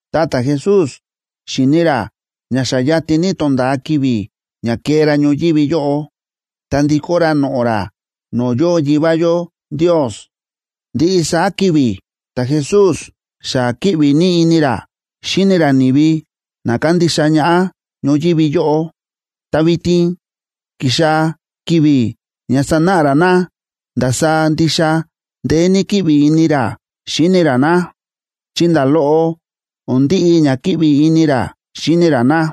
ta ta̱Jesús xíni̱ ra ña xa yatin ní tonda̱a ki̱vi̱ ña kee ra ñoyívi yóꞌo, ta ndikó ra noꞌo̱ ra no̱o̱ yóo Yivá yó Ndios. Ndiꞌi saá ki̱vi̱ ta̱Jesús xa kíꞌvi ní ini ra xíni ra ni̱vi na kándixa ñaꞌá ñoyívi yóꞌo, ta vitin ki̱xaa̱ ki̱vi̱ ña sanáꞌa ra na ndasaá ndixa ndeé ní kíꞌvi ini ra xíni ra na, chi nda̱ loꞌo o̱n ndiꞌi ña kíꞌvi ini ra xíni ra na.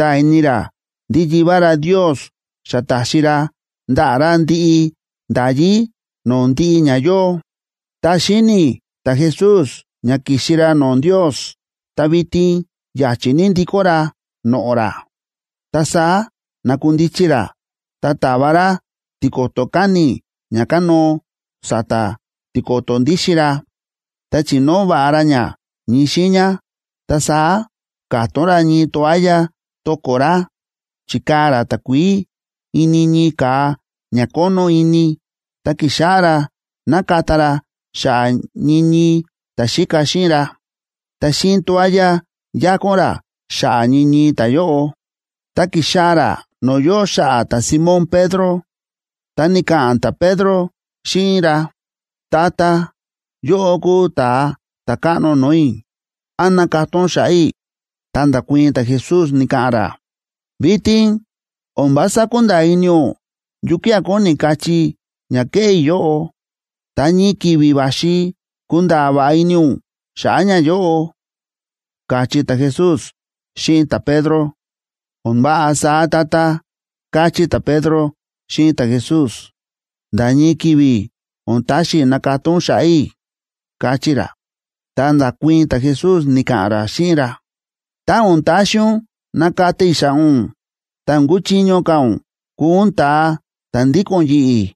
Ta ta̱Jesús kúnda̱a̱ ini ra ndí Yivá ra Ndios xa ta̱xi ra ndaꞌa̱ ra ndiꞌi nda̱yí no̱o̱ ndiꞌi ña yóo, ta xíni̱ ta̱Jesús ña ki̱xi ra no̱o̱ Ndios ta vitin ya̱chi̱ ní ndikó ra noꞌo̱ ra. Ta saá na̱kundichi ra ta ta̱va ra tiko̱to̱ káni̱ ña kánóo sa̱ta̱ tiko̱to̱ ndíxin ra, ta chi̱nóo va̱ꞌa ra ña ñii xiiña, ta saá ka̱tón ra ñii toalla to̱ko̱ ra. Chi̱kaa̱ ra takuií ini ñii ka̱a ña kónó ini, ta ki̱xáꞌá ra nakata ra xa̱ꞌa̱ ñii ñii ta̱xíka xíꞌin ra. Ta xíꞌin toalla yákón ra xa̱ꞌa̱ ñii ñii ta̱yóꞌo. Tá ki̱xaa̱ ra no̱o̱ yóo xa̱ꞌa̱ ta̱Simón Pedro, ta ni̱ka̱ꞌa̱n ta̱Pedro xíꞌin ra: ―Tata, yóꞌó kúu ta̱a ta̱káꞌno no̱o̱ i̱. ¿Án nakata ún xa̱ꞌa̱ i̱? Ta nda̱kuii̱n ta̱Jesús, ni̱ka̱ꞌa̱n ra: ―Vitin o̱n vása kúnda̱a̱ ini ún yukía̱ kóni kachí ña kéꞌé i̱ yóꞌo, ta ñii ki̱vi̱ va̱xi kunda̱a̱ va̱ꞌa ini ún xa̱ꞌa̱ ñayóꞌo ―káchí ta̱Jesús xíꞌin ta̱Pedro. ―O̱n váꞌa saá, Tata ―káchí ta̱Pedro xíꞌin ta̱Jesús ―nda̱ ñii ki̱vi̱ o̱n taxi i̱ nakata ún xa̱ꞌa̱ i̱ ―káchí ra. Ta nda̱kuii̱n ta̱Jesús, ni̱ka̱ꞌa̱n ra xíꞌin ra: ―Tá o̱n taxi ún nakata i̱ xa̱ꞌa̱ ún, ta o̱n kuchiño ka̱ ún kuu ún ta̱a ta̱ ndíko̱n yi̱ꞌi̱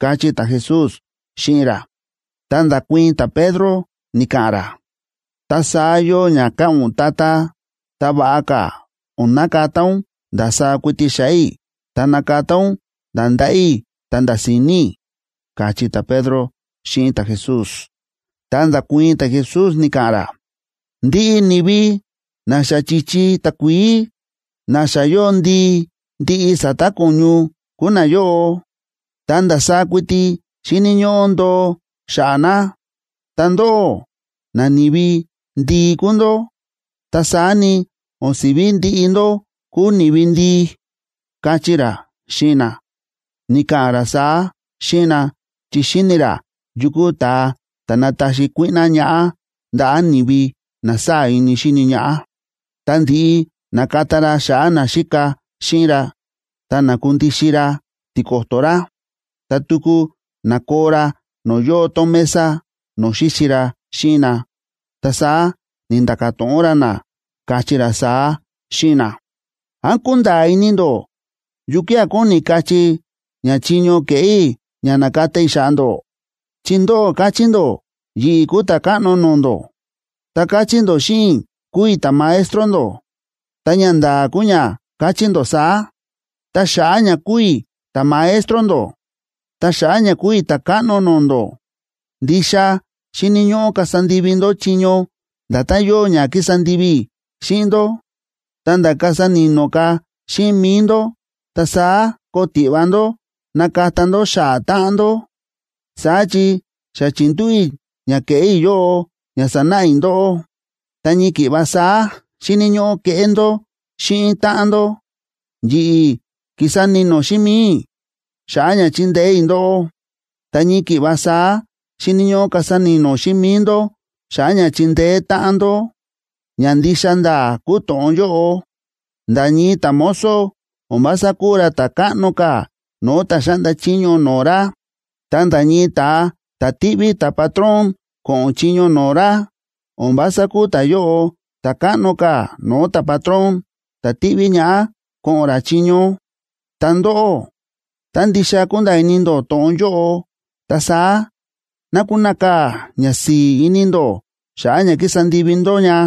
―káchí ta̱Jesús xíꞌin ra. Ta nda̱kuii̱n ta̱Pedro, ni̱ka̱ꞌa̱n ra: ―Tá saá yóo ña káꞌa̱n ún, Tata, ta va̱ꞌa ka̱ o̱n nakata ún ndasaá kuiti xa̱ꞌa̱ i̱, ta nakata ún nda̱ ndaꞌa̱ i̱ ta nda̱ si̱ni̱ i̱ ―káchí ta̱Pedro xíꞌin ta̱Jesús. Ta nda̱kuii̱n ta̱Jesús, ni̱ka̱ꞌa̱n ra: ―Ndiꞌi ni̱vi na xa chi̱chi takuií, na xa yóo ndii ndiꞌi sa̱ta̱ ko̱ñu kúu nayóꞌo, ta ndasaá kuiti xíni̱ ñóꞌó ndoo xa̱ꞌa̱ na. Ta ndóꞌó, nani̱vi ndii kúu ndó, ta saá ni, o̱n si̱ví ndiꞌi ndó kúu ni̱vi ndii ―káchí ra xíꞌin na. Ni̱ka̱ꞌa̱n ra saá xíꞌin na, chi xíni̱ ra yu kúu ta̱a ta̱ nataxi kuíꞌná ñaꞌá ndaꞌa̱ ni̱vi na sáa̱ ini xíni ñaꞌá. Tá ndi̱ꞌi na̱kata ra xa̱ꞌa̱ naxíka xíꞌin ra, ta na̱kundixin ra tiko̱to̱ ra, ta tuku na̱koo ra no̱o̱ yóo tón mesa, no̱o̱ xíxi ra xíꞌin na. Ta saá ni̱nda̱ka̱ to̱ꞌon ra na, káchí ra saá xíꞌin na: ―¿Án kúnda̱a̱ ini ndó yukía̱ kóni kachí ña chiño ke̱ꞌé i̱ ña na̱kata i̱ xa̱ꞌa̱ ndó? Chi ndóꞌó káchí ndó yi̱ꞌi̱ kúu Ta̱káꞌno no̱o̱ ndó, ta káchí ndó xíꞌin i̱ kúu i̱ ta̱Maestro ndó, ta ñanda̱a̱ kúu ña káchí ndó saá. Ta xa̱ꞌa̱ ña kúu i̱ ta̱Maestro ndó, ta xa̱ꞌa̱ ña kúu i̱ Ta̱káꞌno no̱o̱ ndó, ndixa xíni̱ ñóꞌó kasa ndivi ndó chiño nda̱tán yóo ña ki̱sa ndivi i̱ xíꞌin ndó, ta̱nda̱ kasa ni̱no̱ ka̱ xíꞌin mi̱i ndó ta saá koo tiꞌva ndó nakata ndó xa̱ꞌa̱ táꞌan ndó. Saá chi xa chi̱ndúꞌu̱ i̱ ña ke̱ꞌé i̱ yóꞌo ña sanáꞌa i̱ ndóꞌó, ta ñii ki̱ꞌva saá xíni̱ ñóꞌó keꞌé ndó xíꞌin táꞌan ndó. Yi̱ꞌi̱ ki̱sa ni̱no̱ xíꞌin mi̱i i̱ xa̱ꞌa̱ ña chindeé i̱ ndóꞌó, ta ñii ki̱ꞌva saá xíni̱ ñóꞌó kasa ni̱no̱ xíꞌin mi̱i ndó xa̱ꞌa̱ ña chindeé táꞌan ndó. Ña ndixa nda̱a̱ kúu to̱ꞌon yóꞌo: Nda̱ ñii ta̱mozo o̱n vása kúu ra ta̱ káꞌno ka̱ no̱o̱ ta̱ xáꞌnda chiño no̱o̱ ra, ta nda̱ ñii ta̱a ta̱ tíꞌví ta̱patrón ko̱ꞌo̱n chiño no̱o̱ ra, o̱n vása kúu ta̱yóꞌo ta̱ káꞌno ka̱ no̱o̱ ta̱patrón ta̱ ti̱ꞌví ñaꞌá ko̱ꞌo̱n ra chiño. Ta ndóꞌó, tá ndixa kúnda̱a̱ ini ndó to̱ꞌon yóꞌo, ta saá ná kunakaa̱ ñasi̱i̱ ini ndó xa̱ꞌa̱ ña ki̱sa ndivi ndó ña.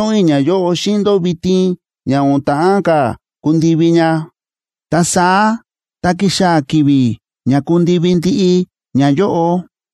Ndáto̱ꞌon i̱ ñayóꞌo xíꞌin ndó vitin ña o̱n ta̱ꞌán ka̱ kundivi ña. Ta saá tá kixaa̱ ki̱vi̱ ña kundivi ndiꞌi ñayóꞌo,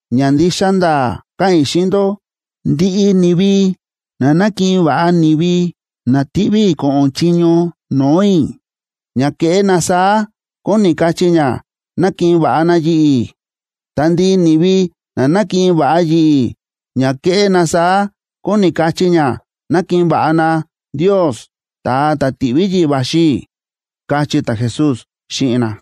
Ña ndixa nda̱a̱ káꞌa̱n i̱ xíꞌin ndó, ndiꞌi ni̱vi na nákiꞌin va̱ꞌa ni̱vi na ti̱ꞌví i̱ ko̱ꞌo̱n chiño no̱o̱ i̱, ña kéꞌé na saá kóni kachí ña nákiꞌin va̱ꞌa na yi̱ꞌi̱. Ta ndiꞌi ni̱vi na nákiꞌin va̱ꞌa yi̱ꞌi̱, ña kéꞌé na saá kóni kachí ña nákiꞌin va̱ꞌa na Ndios, ta̱a ta̱ ti̱ꞌví yi̱ꞌi̱ va̱xi i̱ ―káchí ta̱Jesús xíꞌin na.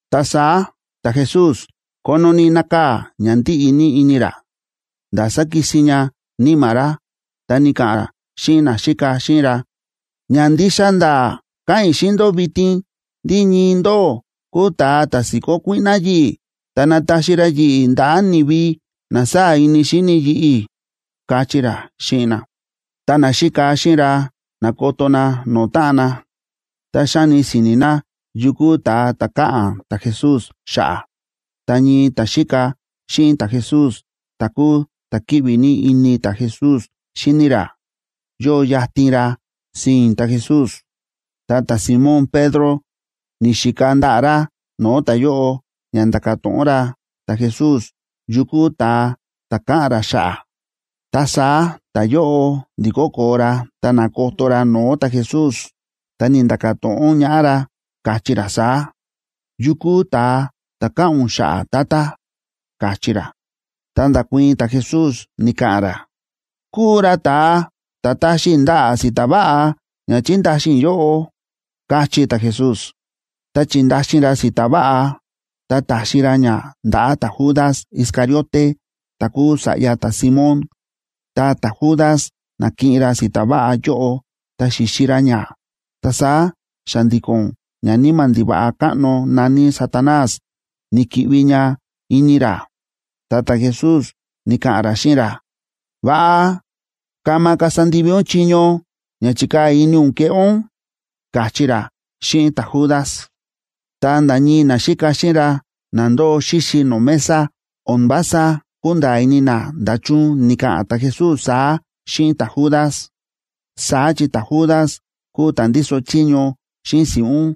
Ta saá ta̱Jesús kónó ní nákaa̱ ña ndíꞌi ní ini ra, nda̱ sákisin ña níma̱ ra, ta ni̱ka̱ꞌa̱n ra xíꞌin naxíka xíꞌin ra: ―Ña ndixa nda̱a̱ káꞌa̱n i̱ xíꞌin ndó vitin ndí ñii ndóꞌó kúu ta̱a ta̱ si̱kó kuíꞌná yi̱ꞌi̱ ta nataxi ra yi̱ꞌi̱ ndaꞌa̱ ni̱vi na sáa̱ ini xíni yi̱ꞌi̱ ―káchí ra xíꞌin na. Ta naxíka xíꞌin ra na̱koto na no̱o̱ táꞌan na, ta xáni si̱ni̱ na yu kúu ta̱a ta̱ káꞌa̱n ta̱Jesús xa̱ꞌa̱. Ta ñii ta̱xíka xíꞌin ta̱Jesús, ta̱ kúu ta̱ kíꞌvi ní ini ta̱Jesús xíni ra, yóo yatin ra sii̱n ta̱Jesús, ta ta̱Simón Pedro ni̱xika ndaꞌa̱ ra no̱o̱ ta̱yóꞌo ña nda̱ka̱ to̱ꞌon ra ta̱Jesús yu kúu ta̱a ta̱ káꞌa̱n ra xa̱ꞌa̱. Ta saá ta̱yóꞌo ndi̱kó koo ra ta na̱koto ra no̱o̱ ta̱Jesús, ta ni̱nda̱ka̱ to̱ꞌon ñaꞌá ra, káchí ra saá: ―¿Yu kúu ta̱a ta̱ káꞌa̱n ún xa̱ꞌa̱, Tata? ―káchí ra. Ta nda̱kuii̱n ta̱Jesús, ni̱ka̱ꞌa̱n ra: ―Kúu ra ta̱a ta̱ taxi i̱ ndaꞌa̱ si̱ta̱ váꞌa ña chindaxin i̱ yóꞌo ―káchí ta̱Jesús. Ta chi̱ndaxin ra si̱ta̱ váꞌa ta ta̱xi ra ña ndaꞌa̱ ta̱Judas Iscariote ta̱ kúu sa̱ꞌya ta̱Simón. Ta ta̱Judas na̱kiꞌin ra si̱ta̱ váꞌa yóꞌo, ta xi̱xi ra ña, ta saá xa̱ndi̱ko̱n ñaníma̱ ndiva̱ꞌa káꞌno na̱ní Satanás ni̱ki̱ꞌvi ña ini ra. Ta ta̱Jesús ni̱ka̱ꞌa̱n ra xíꞌin ra: ―Va̱ꞌa kama kasa ndivi ún chiño ña chi̱kaa̱ ini ún keꞌé ún ―káchí ra xíꞌin ta̱Judas. Ta nda̱ ñii naxíka xíꞌin ra na ndóo xíxi no̱o̱ mesa, o̱n vása kúnda̱a̱ ini na nda̱chun ni̱ka̱ꞌa̱n ta̱Jesús saá xíꞌin ta̱Judas. Saá chi ta̱Judas kúu ta̱ ndíso chiño xíꞌin si̱ꞌún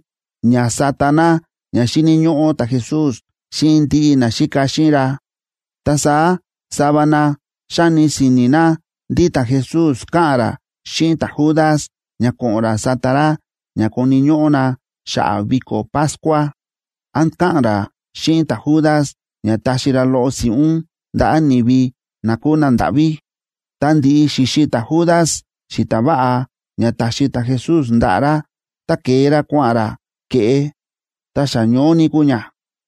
ña sáta na ña xíni̱ ñóꞌó ta̱Jesús xíꞌin ndiꞌi naxíka xíꞌin ra, ta saá sava na xáni si̱ni̱ na ndí ta̱Jesús káꞌa̱n ra xíꞌin ta̱Judas ña ko̱ꞌo̱n ra sata ra ña koni̱ ñóꞌó na xa̱ꞌa̱ viko̱ Pascua, án káꞌa̱n ra xíꞌin ta̱Judas ña taxi ra loꞌo si̱ꞌún ndaꞌa̱ ni̱vi na kúu nandáꞌví. Tá ndi̱ꞌi xi̱xi ta̱Judas si̱ta̱ váꞌa ña ta̱xi ta̱Jesús ndaꞌa̱ ra, ta ke̱e ra kua̱ꞌa̱n ra ke̱ꞌe. Ta xa ñoó ní kúu ña.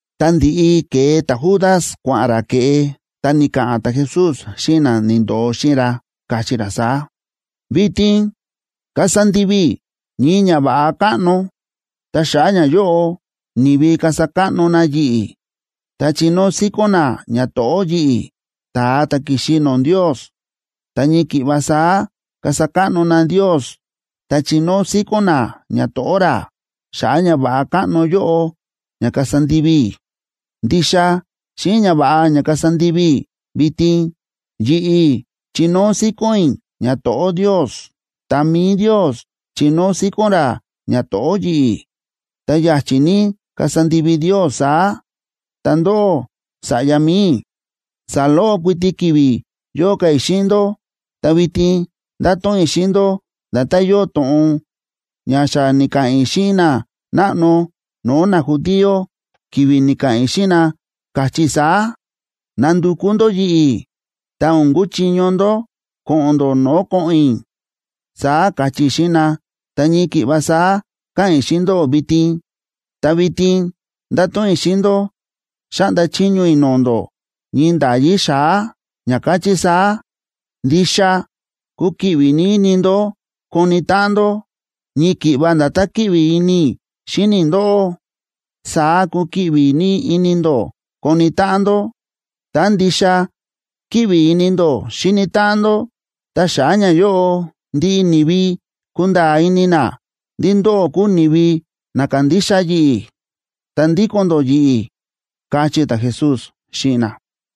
Ta ndi̱ꞌi ke̱e ta̱Judas, kua̱ꞌa̱n ra ke̱ꞌe, ta ni̱ka̱ꞌa̱n ta̱Jesús xíꞌin na ni̱ndo̱o xíꞌin ra, káchí ra saá: ―Vitin kasa ndivi i̱ ñii ñava̱ꞌa káꞌno, ta xa̱ꞌa̱ ñayóꞌo ni̱vi kasa káꞌno na yi̱ꞌi̱ ta chinóo síkón na ñato̱ꞌó yi̱ꞌi̱, ta̱a ta̱ ki̱xi no̱o̱ Ndios. Ta ñii ki̱ꞌva saá kasa káꞌno na Ndios ta chinóo síkón na ñato̱ꞌó ra, xa̱ꞌa̱ ñava̱ꞌa káꞌno yóꞌo ña kasa ndivi i̱. Ndixa xíꞌin ñava̱ꞌa ña kasa ndivi i̱ vitin, yi̱ꞌi̱ chinóo síkón i̱ ñato̱ꞌó Ndios. Ta mi̱i Ndios chinóo síkón ra ñato̱ꞌó yi̱ꞌi̱. Ta ya̱chi̱ ní kasa ndivi Ndios saá. Ta ndóꞌó, sa̱ꞌya mi̱i i̱, saloꞌo kuiti ki̱vi̱ yóo ka̱ i̱ xíꞌin ndó, ta vitin ndato̱ꞌon i̱ xíꞌin ndó nda̱tán yóo to̱ꞌon ña xa ni̱ka̱ꞌa̱n i̱ xíꞌin nanáꞌno no̱o̱ najudío, ki̱vi̱ ni̱ka̱ꞌa̱n i̱ xíꞌin na, káchí i̱ saá: “Nandukú ndó yi̱ꞌi̱, ta o̱n kuchiño ndó ko̱ꞌo̱n ndó no̱o̱ ko̱ꞌo̱n i̱”, saá káchí i̱ xíꞌin na, ta ñii ki̱ꞌva saá káꞌa̱n i̱ xíꞌin ndóꞌó vitin. Ta vitin ndato̱ꞌon i̱ xíꞌin ndó xáꞌnda chiño i̱ no̱o̱ ndó ñii nda̱yí xa̱á, ña káchí saá: Ndixa kukiꞌvi ní ini ndó koni táꞌan ndó. Ñii ki̱ꞌva nda̱tán kíꞌvi ini i̱ xíni i̱ ndóꞌó, saá kukiꞌvi ní ini ndó koni táꞌan ndó. Tá ndixa kíꞌvi ini ndó xíni táꞌan ndó, ta xa̱ꞌa̱ ñayóꞌo ndiꞌi ni̱vi kunda̱a̱ ini na ndí ndóꞌó kúu ni̱vi na kándixa yi̱ꞌi̱ ta ndíko̱n ndó yi̱ꞌi̱ ―káchí ta̱Jesús xíꞌin na.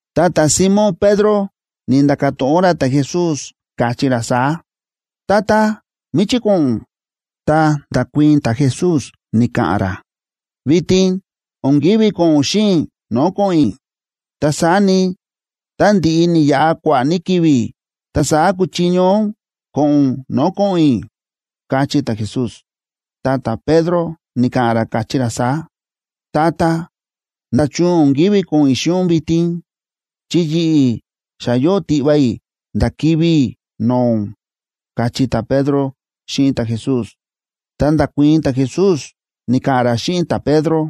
Ta ta̱Simón Pedro ni̱nda̱ka̱ to̱ꞌon ra ta̱Jesús, káchí ra saá: ―Tata, ¿míchí ko̱ꞌo̱n ún? Ta nda̱kuii̱n ta̱Jesús, ni̱ka̱ꞌa̱n ra: ―Vitin o̱n ki̱ví ko̱ꞌo̱n ún xíꞌin i̱ no̱o̱ ko̱ꞌo̱n i̱. Ta saá ni, tá ndi̱ꞌi ni̱yaꞌa kua̱ꞌa̱ ní ki̱vi̱, ta saá kuchiño ún ko̱ꞌo̱n ún no̱o̱ ko̱ꞌo̱n i̱ ―káchí ta̱Jesús. Ta ta̱Pedro ni̱ka̱ꞌa̱n ra, káchí ra saá: ―Tata, ¿nda̱chun o̱n ki̱ví ko̱ꞌo̱n i̱ xíꞌin ún vitin? Chi yi̱ꞌi̱, xa yóo tiꞌva i̱ nda̱ kivi̱ i̱ no̱o̱ ún ―káchí ta̱Pedro xíꞌin ta̱Jesús. Ta nda̱kuii̱n ta̱Jesús, ni̱ka̱ꞌa̱n ra xíꞌin ta̱Pedro: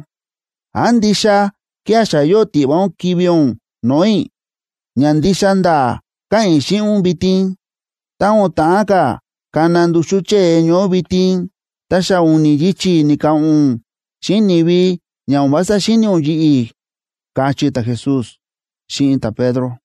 ―¿Án ndixa kía̱ xa yóo tiꞌva ún kivi̱ ún no̱o̱ i̱? Ña ndixa nda̱a̱ káꞌa̱n i̱ xíꞌin ún vitin, tá o̱n ta̱ꞌán ka̱ kana nduxú chée ñoó vitin, ta xa u̱ni̱ yichi̱ ni̱ka̱ꞌa̱n ún xíꞌin ni̱vi ña o̱n vása xíni̱ ún yi̱ꞌi̱ ―káchí ta̱Jesús xíꞌin ta̱Pedro.